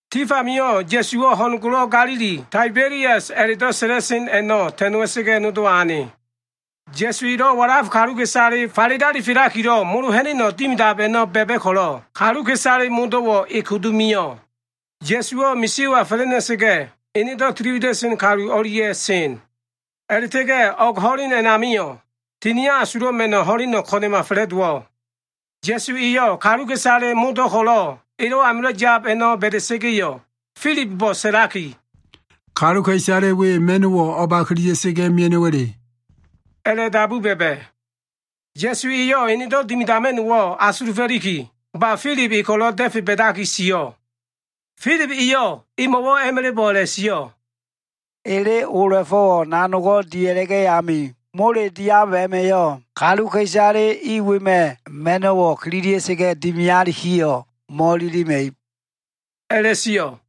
Tif amio꞉ Ya꞉suwo꞉ ho꞉n golo꞉ Ga꞉lili, Taibelias a꞉la꞉do꞉ sa꞉la꞉sen a꞉no꞉ ta꞉noa꞉sa꞉ga꞉ nodowa ane. Ya꞉su elo꞉ walaf kaluka꞉isale falele alifelakilo꞉ molo ha꞉na꞉no꞉ dimidab a꞉no꞉ ba꞉ba꞉ ko꞉lo꞉ kaluka꞉isale modo꞉wo꞉ e kudu mio꞉. Ya꞉suwo꞉ misio꞉wa fa꞉la꞉ ha꞉na꞉sa꞉ga꞉, enedo꞉ tili wida꞉sen kalu o꞉lia꞉ sen. A꞉la꞉ta꞉ga꞉ o꞉g ho꞉len a꞉namio꞉, Tinio꞉ Asulo꞉ Ma꞉no꞉ ho꞉leno꞉ ko꞉na꞉ma fa꞉la꞉dowo꞉. Ya꞉su eyo꞉ kaluka꞉isaleyo꞉ modo꞉ ko꞉lo꞉ elo꞉ amilo꞉ yab a꞉no꞉ ba꞉da꞉sa꞉ga꞉yo꞉, Filibo꞉ sa꞉laki, “Kaluka꞉isale we ma꞉no꞉wo꞉ o꞉ba kililia꞉sa꞉ga꞉ mea꞉no꞉wa꞉le?” a꞉la꞉dabu ba꞉ba꞉. Ya꞉su eyo꞉ enedo꞉ dimidama꞉no꞉wo꞉ asulufo꞉liki, ba Filib e ko꞉lo꞉ da꞉fe ba꞉daki sio꞉. Filib eyo꞉ emo꞉wo꞉ a꞉ma꞉la꞉bo꞉ a꞉la꞉sio꞉, “Ele ola꞉fo꞉wo꞉ nanogo꞉ dia꞉la꞉ga꞉ ami, mole diab a꞉ma꞉yo꞉ kaluka꞉isale i wema꞉ ma꞉no꞉wo꞉ kililia꞉sa꞉ga꞉ dimialikiyo꞉ mo꞉ililima꞉ib” a꞉la꞉sio꞉.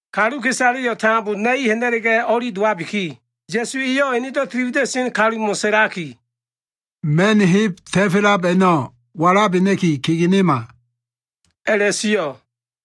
Kaluka꞉isaleyo꞉ tambo na꞉i ha꞉na꞉la꞉ga꞉ o꞉li dowabiki, Ya꞉su eyo꞉ enedo꞉ tiliwida꞉sen kalumo꞉ sa꞉laki, “Ma꞉n heb ta꞉felab a꞉no꞉ walabena꞉ki kegenema” a꞉la꞉sio꞉.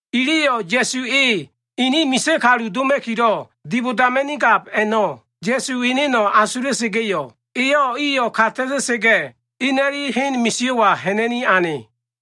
Iliyo꞉ Ya꞉su e ini misa꞉ kalu doma꞉kilo꞉ dibodama꞉nigab a꞉no꞉, Ya꞉su eneno꞉ asula꞉sa꞉ga꞉yo꞉, eyo꞉ iyo꞉ ka ta꞉ta꞉sa꞉ga꞉, ina꞉li hen misio꞉wa ha꞉na꞉ni ane.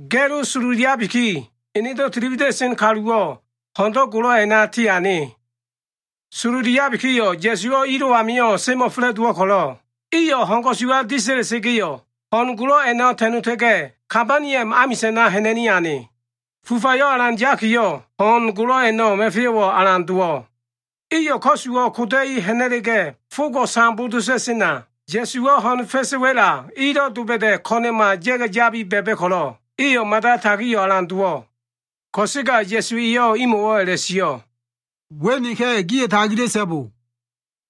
Ga꞉lo sololiabiki, enedo꞉ tiliwida꞉sen kaluwo꞉ ho꞉ndo꞉ golo꞉ a꞉na tiane. Sololiabikiyo꞉ Ya꞉suwo꞉ ilo꞉ amio꞉ semo꞉fa꞉la꞉dowo꞉ ko꞉lo꞉, iyo꞉ ho꞉n ko꞉suwa disa꞉la꞉sa꞉ga꞉yo꞉, ho꞉n golo꞉ a꞉no꞉ ta꞉nota꞉ga꞉ Kabaniom amisa꞉na ha꞉na꞉ni ane. Fufayo꞉ alan yakiyo꞉, ho꞉n golo꞉ a꞉no꞉ ma꞉feyo꞉wo꞉ alan dowo꞉. Iyo꞉ ko꞉suwo꞉ koda꞉i ha꞉na꞉la꞉ga꞉, fogo꞉ sambo dota꞉sena, Ya꞉suwo꞉ ho꞉n fa꞉sa꞉ wa꞉la ilo꞉ doba꞉da꞉ ko꞉na꞉ma ya꞉ga꞉ yabi ba꞉ba꞉ ko꞉lo꞉, iyo꞉ mada tagio꞉ alan dowo꞉. Ko꞉sega Ya꞉su eyo꞉ imo꞉wo꞉ a꞉la꞉sio꞉, “We neka꞉. Gio꞉ tagila꞉so꞉bo!”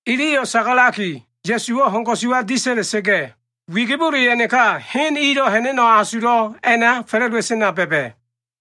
Iliyo꞉ sagalaki, Ya꞉suwo꞉ ho꞉n ko꞉suwa disa꞉la꞉sa꞉ga꞉, wigibole a꞉naka hen ilo꞉ ha꞉na꞉no꞉ asulo꞉ a꞉na fa꞉la꞉dowa꞉sena ba꞉ba꞉.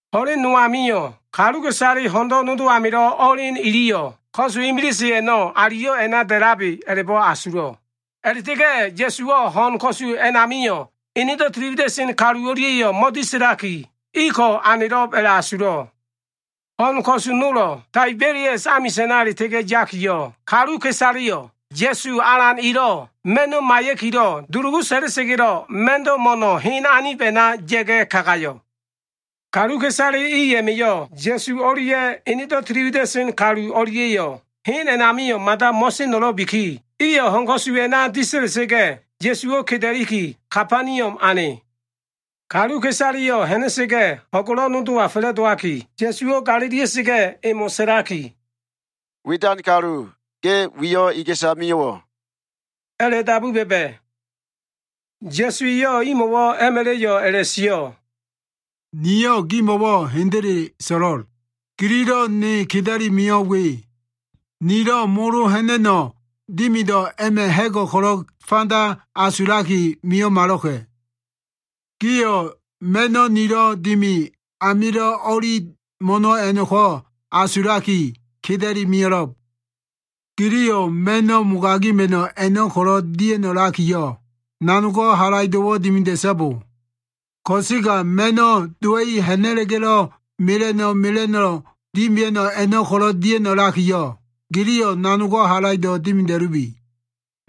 Ho꞉len no amio꞉ kaluka꞉isale ho꞉no꞉ nodo amilo꞉ o꞉elen iliyo꞉ ko꞉su imilise a꞉no꞉ aliyo꞉ a꞉na da꞉labe a꞉la꞉bo꞉ asulo꞉. A꞉la꞉ta꞉ga꞉ Ya꞉suwo꞉ ho꞉n ko꞉su a꞉namio꞉ enedo꞉ tiliwida꞉sen kalu o꞉lia꞉yo꞉ mo꞉disa꞉laki, iko꞉ anelo꞉b a꞉la꞉asulo꞉. Ho꞉n ko꞉su nolo꞉ Taibelias amisa꞉na a꞉la꞉ta꞉ga꞉ yakiyo꞉, kaluka꞉isaleyo꞉ Ya꞉su Alan elo꞉ ma꞉no꞉ maiya꞉kilo꞉ dulugu sa꞉la꞉sa꞉ga꞉lo꞉ ma꞉ndo꞉ mo꞉no꞉ hen anib a꞉na ya꞉ga꞉ kagayo꞉. Kaluka꞉isale i a꞉ma꞉yo꞉ Ya꞉su o꞉lia꞉ enedo꞉ tiliwida꞉sen kalu o꞉lia꞉yo꞉ hen a꞉namio꞉ mada mo꞉seno꞉lo꞉biki, iyo꞉ ho꞉n ko꞉su a꞉na disa꞉la꞉sa꞉ga꞉, Ya꞉suwo꞉ keda꞉liki Kabaniom ane. Kaluka꞉isaleyo꞉ ha꞉na꞉sa꞉ga꞉ ho꞉n golo꞉wo꞉ nodowa fa꞉la꞉dowaki, Ya꞉suwo꞉ galilia꞉sa꞉ga꞉, emo꞉ sa꞉laki, “Widan kalu, ge wiyo꞉ iga꞉sa mio꞉wo꞉?” a꞉la꞉dabu ba꞉ba꞉. Ya꞉su eyo꞉ imo꞉wo꞉ a꞉ma꞉la꞉yo꞉ a꞉la꞉sio꞉, “Niyo꞉ gimo꞉wo꞉ hendele so꞉lo꞉l. Gililo꞉ ne keda꞉li mio꞉ we, nilo꞉ molo ha꞉na꞉no꞉ dimido꞉ a꞉ma꞉ ha꞉go꞉ ko꞉lo꞉ fanda asulaki mio꞉malo꞉ka꞉. Gio꞉ ma꞉no꞉ nilo꞉ dimi amilo꞉ o꞉li mo꞉no꞉ a꞉no꞉ko꞉ asulaki keda꞉i mio꞉lo꞉b. Giliyo꞉ ma꞉no꞉ mogagima꞉no꞉ a꞉no꞉ ko꞉lo꞉ dia꞉no꞉lakiyo꞉, nanogo꞉ halaido꞉wo꞉ dimida꞉so꞉bo. Ko꞉sega ma꞉no꞉ dowa꞉i ha꞉na꞉la꞉ga꞉lo꞉ mela꞉no꞉ mela꞉no꞉lo꞉ dimia꞉no꞉ a꞉no꞉ ko꞉lo꞉ dia꞉no꞉lakiyo꞉, giliyo꞉ nanogo꞉ halaido꞉ dimida꞉lubi.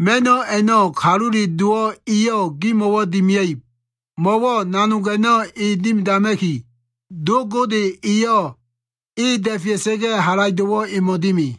Ma꞉no꞉ a꞉no꞉ Kalule Dowo꞉ eyo꞉ gimo꞉wo꞉ dimia꞉ib, mo꞉wo꞉ nanog a꞉no꞉ e dimidama꞉ki, Do Gode eyo꞉ e da꞉fea꞉sa꞉ga꞉, halaido꞉wo꞉ emo꞉ dimi.”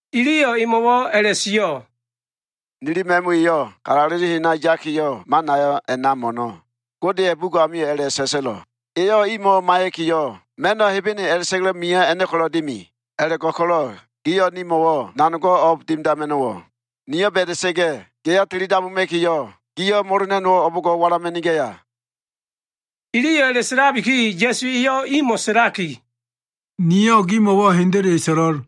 Iliyo꞉ emo꞉wo꞉ a꞉la꞉sio꞉, “Nili ma꞉mu iyo꞉ kalaleli hena yakiyo꞉, manayo꞉ a꞉na mo꞉no꞉. Godeya꞉ bugo꞉ amio꞉ a꞉la꞉sa꞉sa꞉lo꞉, ‘Eyo꞉ imo꞉ maiya꞉kiyo꞉, ma꞉no꞉ Hebene a꞉la꞉ta꞉ga꞉lo꞉ mio꞉ a꞉no꞉ ko꞉lo꞉ dimi.’ A꞉la꞉go꞉ko꞉lo꞉ giyo꞉ nimo꞉wo꞉ nanogo꞉ o꞉b dimidama꞉no꞉wo꞉? Nio꞉ ba꞉da꞉sa꞉ga꞉ geya tilidabuma꞉kiyo꞉, giyo꞉ molo ha꞉na꞉no꞉wo꞉ o꞉bo꞉ngo꞉ walama꞉nigaya?” Iliyo꞉ a꞉la꞉sa꞉labiki, Ya꞉su eyo꞉ imo꞉ sa꞉laki, “Niyo꞉ gimo꞉wo꞉ hendele so꞉lo꞉l.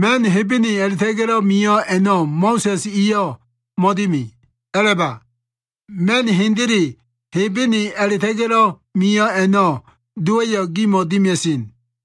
Ma꞉n Hebene a꞉la꞉ta꞉ga꞉lo꞉ mio꞉ a꞉no꞉ Mo꞉sa꞉s eyo꞉ mo꞉dimi. A꞉la꞉ba! Ma꞉n hendele Hebene a꞉la꞉ta꞉ga꞉lo꞉ mio꞉ a꞉no꞉ Dowa꞉yo꞉ gimo꞉ dimia꞉sen.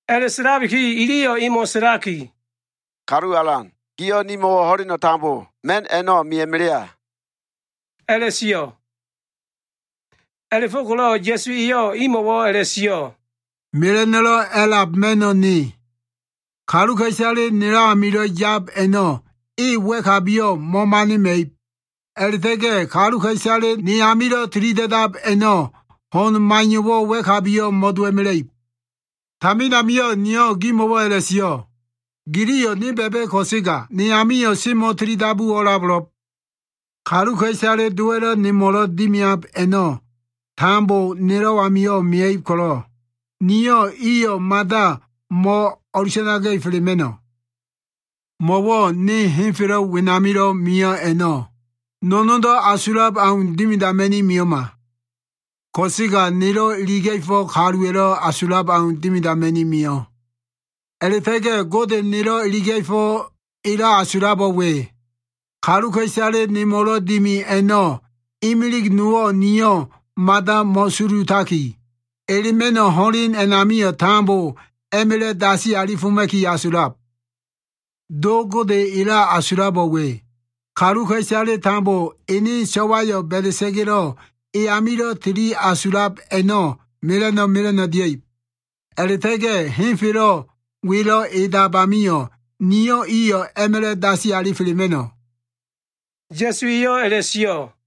A꞉la꞉sa꞉labiki iliyo꞉ emo꞉ sa꞉laki, “Kalu alan, giyo꞉ nimo꞉wo꞉ ho꞉leno꞉ tambo ma꞉n a꞉no꞉ meya꞉melea” a꞉la꞉sio꞉. A꞉la꞉fo꞉ko꞉lo꞉ Ya꞉su eyo꞉ imo꞉wo꞉ a꞉la꞉sio꞉, “Mela꞉no꞉lo꞉ a꞉lab ma꞉no꞉ ne. Kaluka꞉isale nelo꞉ amilo꞉ yab a꞉no꞉ e wa꞉kabiyo꞉ mo꞉manima꞉ib. A꞉la꞉ta꞉ga꞉ kaluka꞉isale ne amilo꞉ tilida꞉dab a꞉no꞉, ho꞉n maiyo꞉wo꞉ wa꞉kabiyo꞉ mo꞉dowa꞉mela꞉ib. Tamin amio꞉ niyo꞉ gimo꞉wo꞉ a꞉la꞉sio꞉. Giliyo꞉ ne ba꞉ba꞉ ko꞉sega, ne amio꞉ semo꞉ tilidabu o꞉labo꞉lo꞉b. Kaluka꞉isale Dowa꞉lo꞉ nemo꞉lo꞉ dimiab a꞉no꞉ tambo nelo꞉ amio꞉ mia꞉ib ko꞉lo꞉, niyo꞉ iyo꞉ mada mo꞉ o꞉lusanaga꞉felema꞉no꞉. Mo꞉wo꞉ ne henfelo꞉ wenamilo꞉ mio꞉ a꞉no꞉, no꞉no꞉ndo꞉ asulab au dimidama꞉ni mio꞉ma. Ko꞉sega nelo꞉ iliga꞉fo꞉ kaluwa꞉lo꞉ asulab au dimidama꞉ni mio꞉. A꞉la꞉ta꞉ga꞉ Gode nelo꞉ iliga꞉fo꞉ elo꞉ asulabo꞉ we. Kaluka꞉isale nemo꞉lo꞉ dimi a꞉no꞉ imilig nowo꞉ niyo꞉ mada mo꞉sulutaki, elema꞉no꞉ ho꞉len amio꞉ tambo a꞉ma꞉la꞉ dasi alifoma꞉ki asulab. Do Gode elo꞉ asulabo꞉ we. Kaluka꞉isaleyo꞉ ene so꞉wayo꞉ ba꞉da꞉sa꞉ga꞉lo꞉ e amilo꞉ tili asulab a꞉no꞉ tambo mela꞉no꞉ mela꞉no꞉ dia꞉ib. A꞉la꞉ta꞉ga꞉ henfelo꞉ welo꞉ edab amio꞉ niyo꞉ iyo꞉ a꞉ma꞉la꞉ dasi alifelema꞉no꞉” Ya꞉su eyo꞉ a꞉la꞉sio꞉.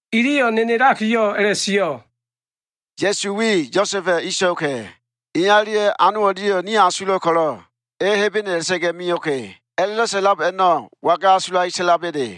Iliyo꞉ nenelakiyo꞉ a꞉la꞉sio꞉, “Ya꞉su we, Yosa꞉ba꞉ inso꞉ka꞉. Iya o꞉lia꞉ ano o꞉lia꞉yo꞉ nio꞉ asulo꞉ ko꞉lo꞉, e ‘Hebene a꞉la꞉ta꞉ga꞉ mio꞉ka꞉’ a꞉la꞉do꞉ sa꞉lab a꞉no꞉ waga asulaki sa꞉laba꞉le?”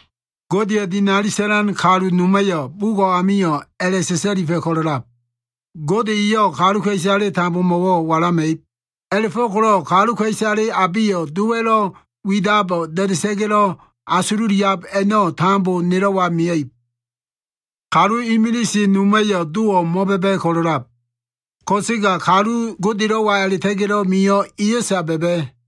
Godeya꞉ dinali sa꞉lan kalu noma꞉yo꞉ bugo꞉ amio꞉ a꞉la꞉sa꞉sa꞉lifa꞉ ko꞉lo꞉lab, ‘Gode eyo꞉ kaluka꞉isale tambomo꞉wo꞉ walama꞉ib.’ A꞉la꞉fo꞉ko꞉lo꞉ kaluka꞉isale abeyo꞉ Dowa꞉lo꞉ widabo꞉ da꞉da꞉sa꞉ga꞉lo꞉ asululiab a꞉no꞉ tambo nelo꞉wa mia꞉ib. Kalu imilise noma꞉yo꞉ Dowo꞉ mo꞉ba꞉ba꞉ ko꞉lo꞉lab. Ko꞉sega kalu Godelo꞉wa a꞉la꞉ta꞉ga꞉lo꞉ mio꞉ eyo꞉sa ba꞉ba꞉.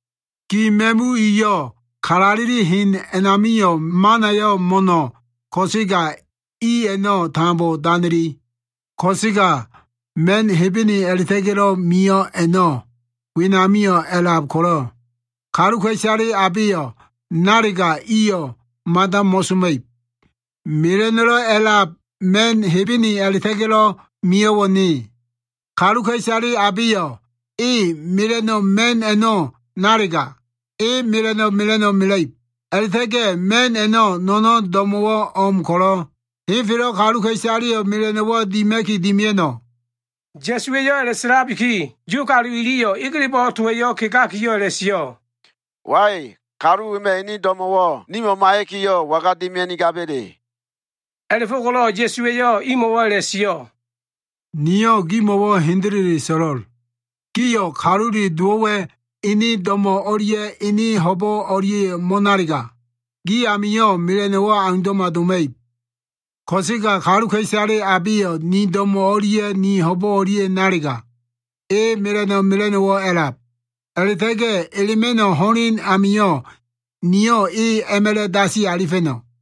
Gi ma꞉mu iyo꞉ kalaleli hen amio꞉ manayo꞉ mo꞉no꞉ ko꞉sega i a꞉no꞉ tambo danili. Ko꞉sega ma꞉n Hebene a꞉la꞉ta꞉ga꞉lo꞉ mio꞉ a꞉no꞉ wenamio꞉ a꞉lab ko꞉lo꞉, kaluka꞉isale abeyo꞉ nalega iyo꞉ mada mo꞉soma꞉ib. Mela꞉no꞉lo꞉ a꞉lab ma꞉n Hebene a꞉la꞉ta꞉ga꞉lo꞉ mio꞉wo꞉ ne. Kaluka꞉isale abeyo꞉ e mela꞉no꞉ ma꞉n a꞉no꞉ nalega, e mela꞉no꞉ mela꞉no꞉ mela꞉ib. A꞉la꞉ta꞉ga꞉ ma꞉n a꞉no꞉ no꞉no꞉n do꞉mo꞉wo꞉ o꞉m ko꞉lo꞉, henfelo꞉ kaluka꞉isaleyo꞉ mela꞉no꞉wo꞉ dima꞉ki dimia꞉no꞉.” Ya꞉suwa꞉yo꞉ a꞉la꞉sa꞉labiki, Yu kalu iliyo꞉ egelebo꞉ towa꞉yo꞉ kegakiyo꞉ a꞉la꞉sio꞉, “Wai, kalu wema꞉ ene do꞉mo꞉wo꞉ nimo꞉ maiya꞉kiyo꞉ waga dimia꞉nigaba꞉le?” A꞉la꞉fo꞉ko꞉lo꞉ Ya꞉su eyo꞉ imo꞉wo꞉ a꞉la꞉sio꞉, “Niyo꞉ gimo꞉wo꞉ hendele so꞉lo꞉l. Gio꞉ Kalule Dowo꞉wa꞉ ene do꞉mo꞉ o꞉lia꞉ ene ho꞉bo꞉ o꞉lia꞉yo꞉ mo꞉nalega, gi amio꞉ mela꞉no꞉wo꞉ aundo꞉ma doma꞉ib. Ko꞉sega kaluka꞉isale abeyo꞉ ni do꞉mo꞉ o꞉lia꞉ ni ho꞉bo꞉ o꞉lia꞉yo꞉ nalega, e mela꞉no꞉ mela꞉no꞉wo꞉ a꞉lab. A꞉la꞉ta꞉ga꞉ elema꞉no꞉ ho꞉len amio꞉, niyo꞉ e a꞉ma꞉la꞉ dasi alifa꞉no꞉.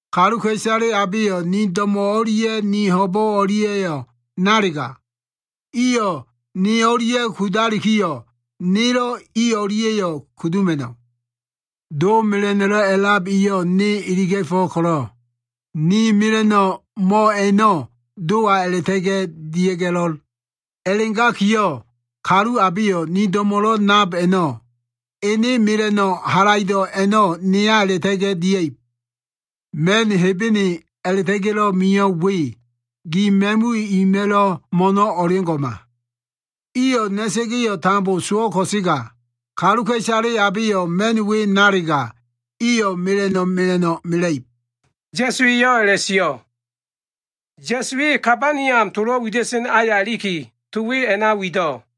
Kaluka꞉isale abeyo꞉ ni do꞉mo꞉ o꞉lia꞉ ni ho꞉bo꞉ o꞉lia꞉yo꞉ nalega, iyo꞉ ne o꞉lia꞉ kudalikiyo꞉, nelo꞉ i o꞉lia꞉yo꞉ kuduma꞉no꞉. Do mela꞉no꞉lo꞉ a꞉lab eyo꞉ ne iliga꞉fo꞉ ko꞉lo꞉, ni mela꞉no꞉ mo꞉ a꞉no꞉ Dowa a꞉la꞉ta꞉ga꞉ dia꞉ga꞉lo꞉l. A꞉la꞉gakiyo꞉, kalu abeyo꞉ ni do꞉mo꞉lo꞉ nab a꞉no꞉, ene mela꞉no꞉ halaido꞉ a꞉no꞉ neya a꞉la꞉ta꞉ga꞉ dia꞉ib. Ma꞉n Hebene a꞉la꞉ta꞉ga꞉lo꞉ mio꞉ we, gi ma꞉mu ima꞉lo꞉ mo꞉no꞉ o꞉leo꞉ngo꞉ma. Iyo꞉ na꞉sa꞉ga꞉yo꞉ tambo sowo꞉ ko꞉sega, kaluka꞉isale abeyo꞉ ma꞉n we nalega, iyo꞉ mela꞉no꞉ mela꞉no꞉ mela꞉ib,” Ya꞉su eyo꞉ a꞉la꞉sio꞉. Ya꞉su e Kabaniom tolo꞉ wida꞉sen aya iliki, to we a꞉na wido꞉.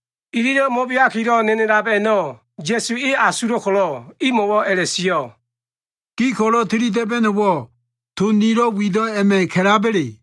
Ililo꞉ mo꞉beakilo꞉ nenelab a꞉no꞉ Ya꞉su e asulo꞉ ko꞉lo꞉, imo꞉wo꞉ a꞉la꞉sio꞉, “Gi ko꞉lo꞉ tili da꞉ba꞉no꞉wo꞉, to nilo꞉ wido꞉ a꞉ma꞉ ka꞉laba꞉le?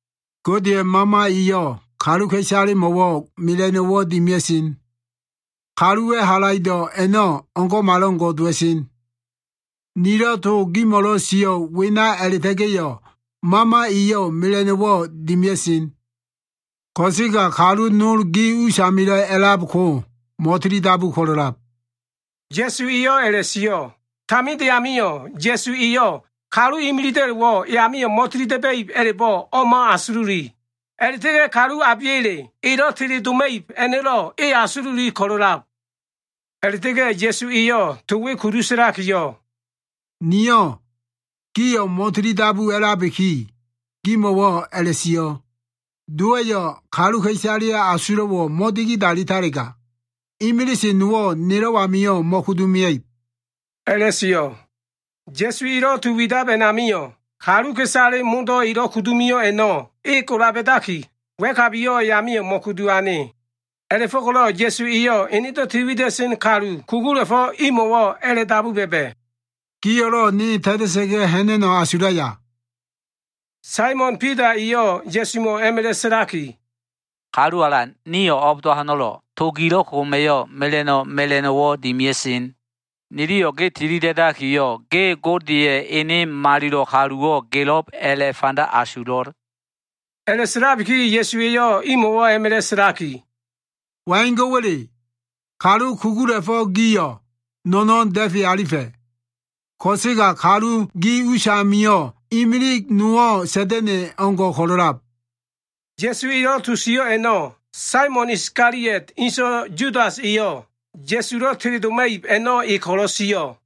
Godeya꞉ Mama eyo꞉ kaluka꞉isalemo꞉wo꞉ mela꞉no꞉wo꞉ dimia꞉sen. Kaluwa꞉ halaido꞉ a꞉no꞉ o꞉ngo꞉malo꞉ngo꞉ dowa꞉sen. Nilo꞉ to gimo꞉lo꞉ sio꞉ wena a꞉la꞉ta꞉ga꞉yo꞉, Mama eyo꞉ mela꞉no꞉wo꞉ dimia꞉sen. Ko꞉sega kalu nol gi usamilo꞉ a꞉lab ko mo꞉tilidabu ko꞉lo꞉lab” Ya꞉su eyo꞉ a꞉la꞉sio꞉. Taminde amio꞉ Ya꞉su eyo꞉ kalu imilida꞉lo꞉wo꞉ e amio꞉ mo꞉tilida꞉ba꞉ib a꞉la꞉bo꞉ o꞉ma asululi. A꞉la꞉ta꞉ga꞉ kalu abeya꞉le elo꞉ teledoma꞉ib a꞉no꞉lo꞉ e asululi ko꞉lo꞉lab. A꞉la꞉ta꞉ga꞉ Ya꞉su eyo꞉ to we kudu sa꞉laki, “Niyo꞉ gio꞉ mo꞉tilidabu a꞉labiki, gimo꞉wo꞉ a꞉la꞉sio꞉, ‘Dowa꞉yo꞉ kaluka꞉isaleya꞉ asulo꞉wo꞉ mo꞉digidalitalega, imilise nowo꞉ nelo꞉ amio꞉ mo꞉kudu mia꞉ib,’” a꞉la꞉sio꞉. Ya꞉su elo꞉ to wido꞉ a꞉namio꞉, kaluka꞉isale modo꞉ elo꞉ kudu mio꞉ a꞉no꞉ e gola ba꞉daki, wa꞉kabiyo꞉ e amio꞉ mo꞉kudu ane. A꞉la꞉fo꞉ko꞉lo꞉ Ya꞉su eyo꞉ enedo꞉ tiliwida꞉sen kalu kugula꞉fo꞉ imo꞉wo꞉ a꞉la꞉dabu ba꞉ba꞉, “Gio꞉lo꞉ ne ta꞉ta꞉sa꞉ga꞉ ha꞉na꞉no꞉ asulaya?” Saimon Bida eyo꞉ Ya꞉sumo꞉ a꞉ma꞉la꞉ sa꞉laki, “Kalu Alan, nio꞉ o꞉bdo꞉wa ho꞉no꞉lo꞉? To gilo꞉ koma꞉yo꞉ mela꞉no꞉ mela꞉no꞉wo꞉ dimia꞉sen. Niliyo꞉ ge tilida꞉dakiyo꞉, ge Godeya꞉ Ene Malilo꞉ kaluwo꞉ gelo꞉b a꞉la꞉fanda asulo꞉.” A꞉la꞉sa꞉labiki Ya꞉su eyo꞉ imo꞉wo꞉ a꞉ma꞉la꞉ sa꞉laki, “Waingo꞉wa꞉le? Kalu kugula꞉fo꞉ gio꞉, no꞉no꞉n da꞉fe alifa꞉. Ko꞉sega kalu gi usamio꞉ imilig nowo꞉ Sa꞉da꞉na꞉ o꞉ngo꞉ ko꞉lo꞉lab.” Ya꞉su elo꞉ to sio꞉ a꞉no꞉, Saimon Iskaliot inso꞉ Yudas eyo꞉, Ya꞉sulo꞉ teledoma꞉ib a꞉no꞉ e ko꞉lo꞉ sio꞉.